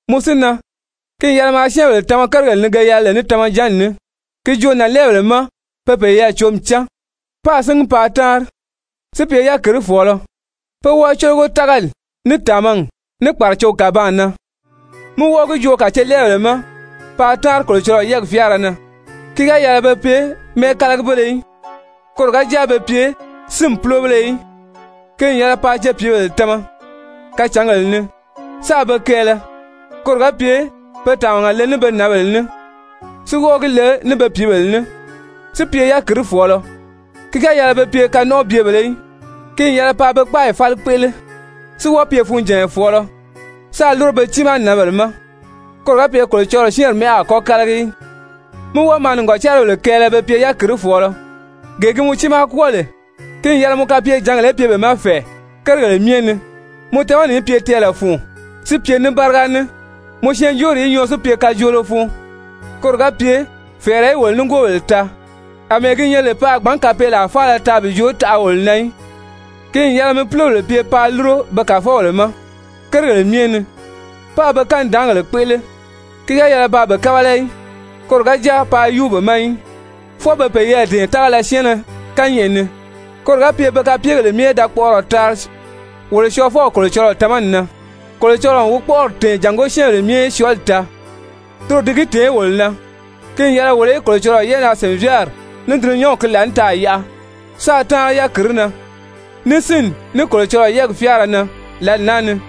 Mɔ si na, ki n yɛlɛ maa syɛ́ɛnbèle tama kérigèle ni ge yɛlɛ lè ní tamajanni ní. Ki joo nànlɛɛbèle ma pe peyɛɛ cǒmi cán páā síngi paa táanri, si pye yákirifɔɔlɔ, pé wɔ́ɔ cólogo tágali, ní tàmagi, ní kpàracogi kàbaan na. Mí wɔ́ɔ gi joo kàcelɛɛbèle ma paa táanri Kolocɔlɔɔ yɛ́ɛgi fyáara na, ki ga yɛlɛ be pye mɛ́ɛkalagibéle í, koro ga jáa be pye sínmi púlobéle í. Ki n yɛlɛ paa cepiibèle tama kacǎngèle ni, sáā be kɛɛlɛ, koro ga pye pe tàmaga le ní be nǎnbèle ní si wɔ́ɔ gi le ní be pìíbèle ní, si pye yákirifɔɔlɔ, ki ga yɛlɛ be pye kanɔnʔɔbyebèlē í, ki n yɛlɛ paa be kpáayi fáli kpéʔele, si wɔ́ɔ pye funjànya fɔ̀ɔlɔ sáā lúro be tiimaa nǎnbèle ma, koro ga pye Kolocɔlɔɔ syɛ́ɛnri mɛ́ʔɛ a kɔ́ kálagi í. Mi wɔ́ɔ maa nìgɔcaribèle kɛɛlɛ be pye yákirifɔɔlɔ. Gee gi mɔ tiimaa kwɔ́ɔ lè, ki n yɛlɛ mɔ kapyejǎngèle í pye be ma fɛ̀ɛ kérigèle myɛ ni, mɔ tamani í pye tɛɛlɛ fun si pye ní báriga ní, mɔ syɛɛnjóori í nyɔɔ si pye kajoolo fun, koro ga pye fɛ̀ɛrɛ í wolo nigoobèle taa, àmɛɛ gi nyɛ lè pe a gbǎn kapeelaa faala taa bi joo taʔa wolo na í. Ki n yɛlɛ mi púlobèle pye paa lúro be kàfɔbèle ma kérigèle myɛ ni páā be kanidaangèle kpéʔele, ki ga yɛlɛ paa be kábala í, koro ga jáa bàā yúu be ma í, fwɔɔ be peyɛɛ dɛ̀ɛn tágala syɛɛnnɛ kányɛʔɛ ni, koro ga pye pe kapyegèle myɛ í da kpɔʔɔrɔ taari wolo Syɔɔfɔw Kolocɔlɔɔ tamani na. Kolocɔlɔɔ n wi kpɔ́ʔɔri tɛ̀ɛn jàngó syɛ́ɛnbèle myɛ í syɔɔli taa. Toro di gi tèé wolo na ki n yɛlɛ wolo í Kolocɔlɔɔ yɛ́ʔɛnaa-sìnvyaari ní dulunyanw ki laànitaʔa yaʔa sáā táanri yákirii na, ní sínni, ní Kolocɔlɔɔ yɛ́ɛgi fyáara na lǎli naa ni,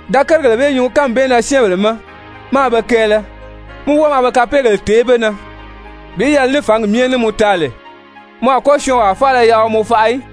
Da kérigèle bee nyuu kánmi bee na syɛ́ɛnbèle ma, máā be kɛɛlɛ, mí wɔ́ɔ maa be kapeegèle tèé be na bi yɛlɛ ní fǎngi myɛ ní mɔ taa lè. Mɔ a kɔ́ syɔɔnwaa faala yaʔa wi mɔ faʔa í.